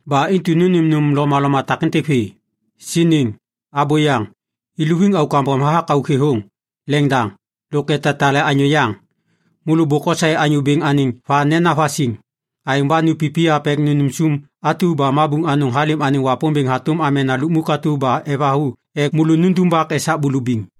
Ba intu nônêm nôm lomaloma takêntêk vê. Siniŋ, abôyaŋ, iluviŋ auk kambom hathak auk thêthôŋ, leŋdaŋ, lôk etatale anyô yaŋ. Môlô bôk osaê Anyô Bêŋ anêŋ va nena vasiŋ. Aêŋ ba nupipiyap ek nunum sum atu ba mabuŋ anôŋ halêm anêŋ Wapômbêŋ hatôm amena lukmuk atu ba evathu ek môlô nundumbak esak bulubiŋ.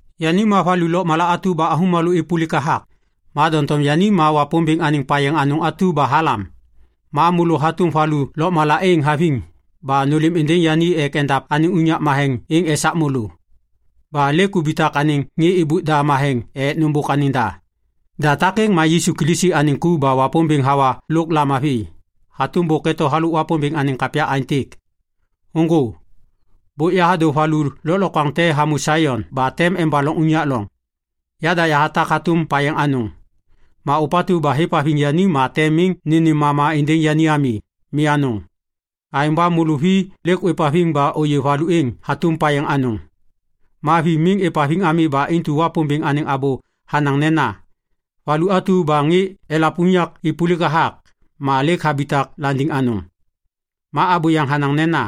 Yani ma valu lôkmala atu ba avômalô êpôlik hathak. Ma doŋtom yani ma Wapômbêŋ anêŋ payeŋ anôŋ atu ba halam. Ma môlô hatôm valu lôkmala êŋ haviŋ ba nôlêm êndêŋ yani ek endav anêŋ unyak matheŋ êŋ esak môlô. Ba lêk ubitak anêŋ ŋê êbôk da matheŋ ek nôbôk anêŋ da. Da takêŋ ma Yisu Kilisi anêŋ ku ba Wapômbêŋ hawa lôk lamavi. Hatôm bôk eto halôk Wapômbêŋ anêŋ kapya aêntêk, “Ôŋgô. Bôk yahadô valu lôklokwaŋ te hamô Saion ba tem embaloŋ unyak loŋ. Yada yahatak hatôm payeŋ anôŋ. Ma ôpatu ba hêvhaviŋ yani ma tem miŋ nênêm mama êndêŋ yani ami. Mi anôŋ.” Aêŋ ba môlô vi lêk ôêvhaviŋ ba ôyê valu êŋ hatôm payeŋ anôŋ. Ma vi miŋ êvhaviŋ ami ba intu Wapômbêŋ anêŋ abô hanaŋ nena, “Valu atu ba ŋê elav unyak êpôlik hathak, ma lêk habitak landiŋ anôŋ.” Ma abô yaŋ hanaŋ nena,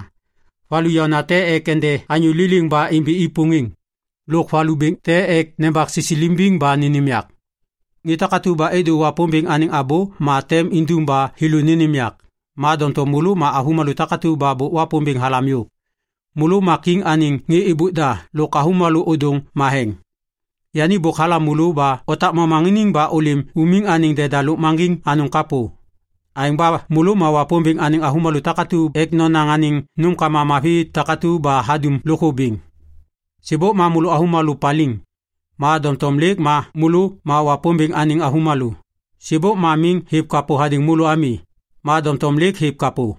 “Valu yaôna te ek ende anyô liliŋ ba imbi i pôŋêŋ lôk valu bêŋ te ek nembak sisilimbiŋ ba nênêm yak.” Ŋê takatu ba êdô Wapômbêŋ anêŋ abô ma tem indum ba thêlô nênêm yak. Ma doŋtom môlô ma avômalô takatu ba bôk Wapômbêŋ halam yôv. Môlô ma kiŋ anêŋ ŋê êbôk da lôk avômalô ôdôŋ matheŋ. Yani bôk halam môlô ba otak momaŋiniŋ ba ôlêm umiŋ anêŋ deda lôkmaŋgiŋ anôŋ kapô. Aêŋ ba môlô ma Wapômbêŋ anêŋ avômalô takatu ek nonaŋ anêŋ nômkama mavi takatu ba hadum lôkthô bêŋ. Sêbôk ma môlô avômalô paliŋ. Ma doŋtom lêk ma môlô ma Wapômbêŋ anêŋ avômalô. Sêbôk ma miŋ hêv kapô hadêŋ môlô ami. Ma doŋtom lêk hêv kapô.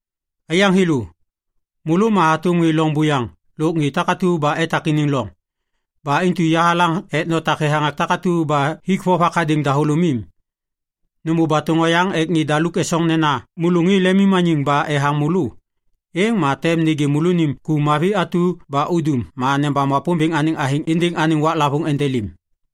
Aiyaŋ thêlô, môlô ma hatôm ŋê loŋ buyaŋ lôk ŋê takatu ba etak iniŋ loŋ. Ba intu yahalaŋ ek notak thethaŋak takatu ba hik vovak hadêŋ dahôlômim. Nômô batôŋ oyaŋ ek ŋê daluk esoŋ nena môlô ŋê lemimmaniŋ ba ethaŋ môlô, êŋ ma tem nêgê môlônim ku mavi atu ba udum ma nebam Wapômbêŋ anêŋ athêŋ êndêŋ anêŋ waklavôŋ endelêm.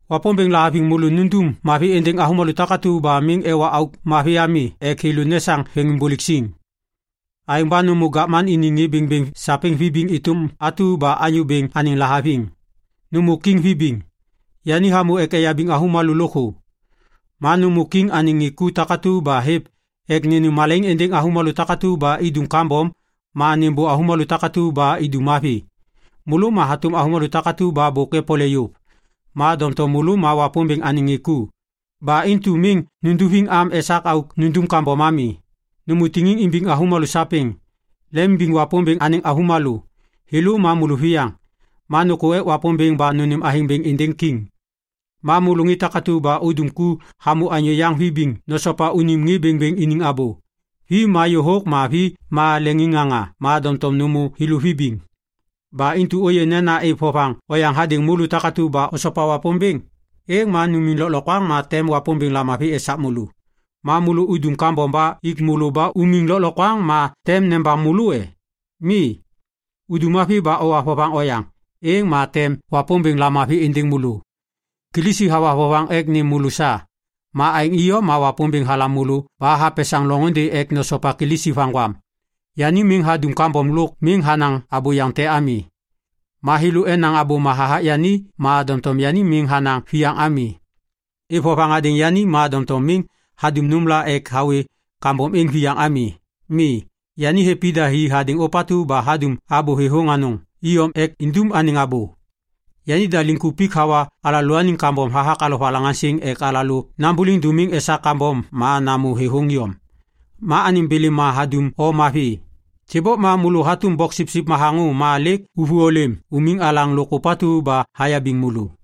Wapômbêŋ lahaviŋ môlô nundum mavi êndêŋ avômalô takatu ba miŋ ewa auk mavi ami ek thêlô nesaŋ veŋiŋbôlêk siŋ. Aêŋ ba nômô gavman iniŋ ŋê bêŋbêŋ sapêŋ vibiŋ êtôm atu ba Anyô Bêŋ anêŋ lahaviŋ. Nômô kiŋ vibiŋ. Yani hamôŋ ek eyabiŋ avômalô lôkthô. Ma nômô kiŋ anêŋ ŋê ku takatu ba hêv ek nênêm malaiŋ êndêŋ avômalô takatu ba idum kambom ma nêmbô avômalô takatu ba idum mavi. Môlô ma hatôm avômalô takatu ba bôk epole yôv. Ma doŋtom môlô ma Wapômbêŋ anêŋ ŋê ku. Ba intu miŋ nunduviŋ am esak auk nundum kambom ami. Nômô tiŋiŋ imbiŋ avômalô sapêŋ. Lemimbiŋ Wapômbêŋ anêŋ avômalô. Thêlô ma môlôviyaŋ. Ma nôkô ek Wapômbêŋ ba nônêm athêŋ bêŋ êndêŋ kiŋ. Ma môlô ŋê takatu ba udum ku hamô anyô yaŋ vibiŋ nosopa unim ŋê bêŋbêŋ iniŋ abô. Vi ma yôhôk ma vi ma leŋiŋŋaŋa ma doŋtom nômô thêlô vibiŋ. Ba intu ôyê nena êv vovaŋ oyaŋ hadêŋ môlô takatu ba osopa Wapômbêŋ, êŋ ma numiŋ lôklokwaŋ ma tem Wapômbêŋ lamavi esak môlô. Ma môlô udum kambom ba ik môlô ba umiŋ lôklokwaŋ ma tem nebam môlô e? Mi. Udum mavi ba owa vovaŋ oyaŋ, êŋ ma tem Wapômbêŋ lamavi êndêŋ môlô. Kilisi hawa vovaŋ ek nêm môlô sa. Ma aêŋ iyom ma Wapômbêŋ halam môlô ba hapesaŋ loŋôndê ek nosopa Kilisi vaŋgwam. “Yani miŋ hadum kambom lôk miŋ hanaŋ abôyaŋ te ami.” Ma thêlô enaŋ abôma hathak yani ma doŋtom yani miŋ hanaŋ viyaŋ ami. Êv vovaŋ hadêŋ yani ma doŋtom miŋ hadum nômla ek hawê kambom êŋ viyaŋ ami. Mi. Yani hêv ida hi hadêŋ ôpatu ba hadum abô thêthôŋ anôŋ iyom ek indum anêŋ abô. Yanida liŋkupik hawa alalôaniŋ kambom hathak alovalaŋaŋsiŋ ek alalô nambôliŋ dômiŋ esak kambom ma namô thêthôŋ iyom. Ma anêŋ bêlêma hadum o mavi. Sêbôk ma môlô hatôm boksipsip mathaŋô ma lêk ôvô ôlêm unim alaŋ lôk ôpatu ba hayabiŋ môlô.